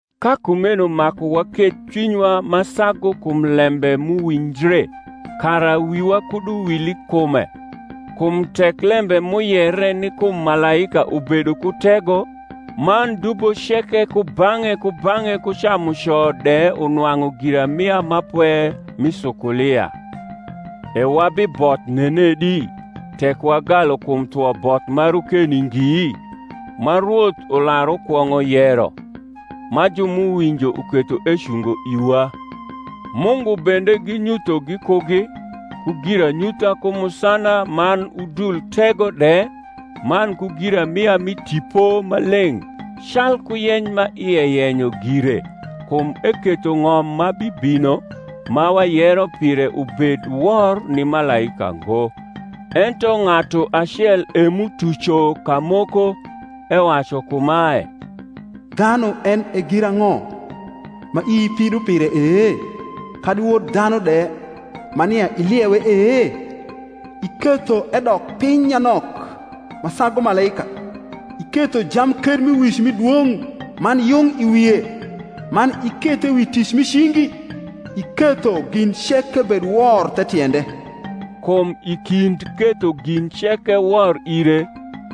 Ka kumeno maku waketh cwinywa ma sagu kum lembe m’uwinjre, kara wiwa kud uwil i kume. Kum tek lembe m’uyere ni kum malaika ubedo ku tego, man dubo ceke kubang’e kubang’e ku camuco de unwang’u giramia ma pwe mi sukulia: e wabiboth nenedi, tek wagalu kum thwo both ma rokeni ngi? ma Rwoth ular ukwong’o yero, ma ju m’uwinjo uketho ecungo iwa: Mungu bende ginyutho gikugi, ku giranyutha ku musana man udul tego de, man ku giramia mi Tipo Maleng’, calku yeny ma ie yenyo gire. Kum eketho ng’om ma bibino, ma wayero pire ubed wor ni malaika ngo. Ento ng’atu acel e m’utuco kamoko, ewacu kumae, Dhanu en e girang’o, ma ii pido pire e? Kadi wod dhanu de, ma nia iliewe e? Iketho edok piny nyanok ma sagu malaika; Iketho jamkermiwic mi dwong’ man yung i wie, Man ikethe wi tic mi cingi: Iketho gin ceke bed wor the tiende. Kum i kind ketho gin ceke wor ire,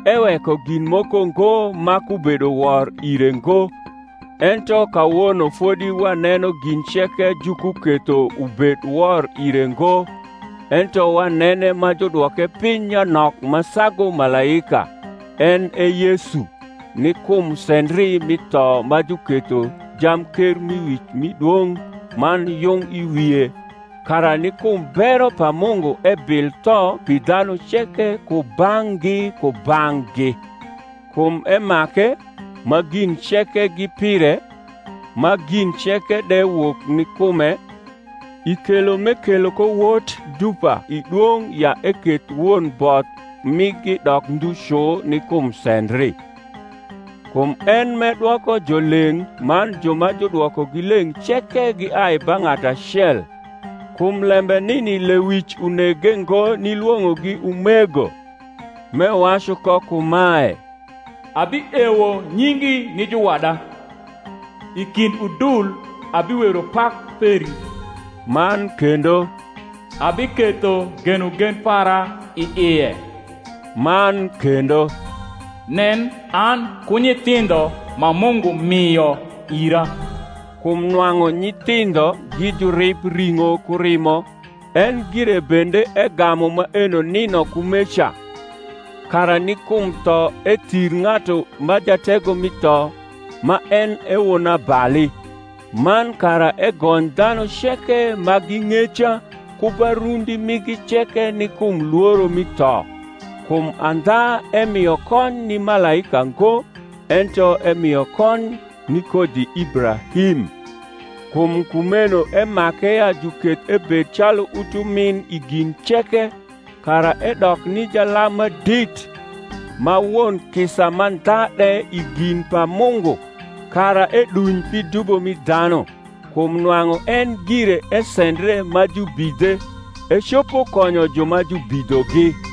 eweko gin moko ngo ma kubedo wor ire ngo. Ento kawono fodi waneno gin ceke jukuketho ubed wor ire ngo. Ento wanene ma judwoke piny nyanok ma sagu malaika, en e Yesu, ni kum sendri mi tho ma juketho jamkermiwic mi dwong’ man yung i wie, kara ni kum bero pa Mungu ebil tho pi dhanu ceke kubang’gi kubang’gi. Kum emake, ma gin ceke gi pire, ma gin ceke de wok ni kume, i kelo m’ekelo ko wot dupa i dwong’ ya eketh won both migi dok ndhu cu ni kum sendri. Kum en m’edwoko jo leng’ man ju ma judwokogi leng’ ceke giai ba ng’atu acel: kum lembe nini lewic unege ngo nilwong’ogi umego, m’ewacu ko kumae, Abiewo nyingi ni juwada, I kind udul abiwero pak peri. Man kendo, Abiketho genogen para i ie. Man kendo, Nen, an ku nyithindho ma Mungu mio ira. Kum nwang’u nyithindho gi jurib ring’o ku rimo, en gire bende egamu maeno nino kumeca; kara ni kum tho ethir ng’atu ma jatego mi tho, ma en e wonabali; man kara egony dhanu ceke ma gi ng’eca ku ba rundi migi ceke ni kum lworo mi tho. Kum andha emio kony ni malaika ngo, ento emio kony ni kodhi Ibrahim. Kum kumeno emake ya juketh ebed calu utumin i gin ceke, kara edok ni jalam ma dit, ma won kisa mandha de i gin pa Mungu, kara eduny pi dubo mi dhanu. Kum nwang’u en gire esendre ma jubidhe, ecopo konyo ju ma jubidhogi.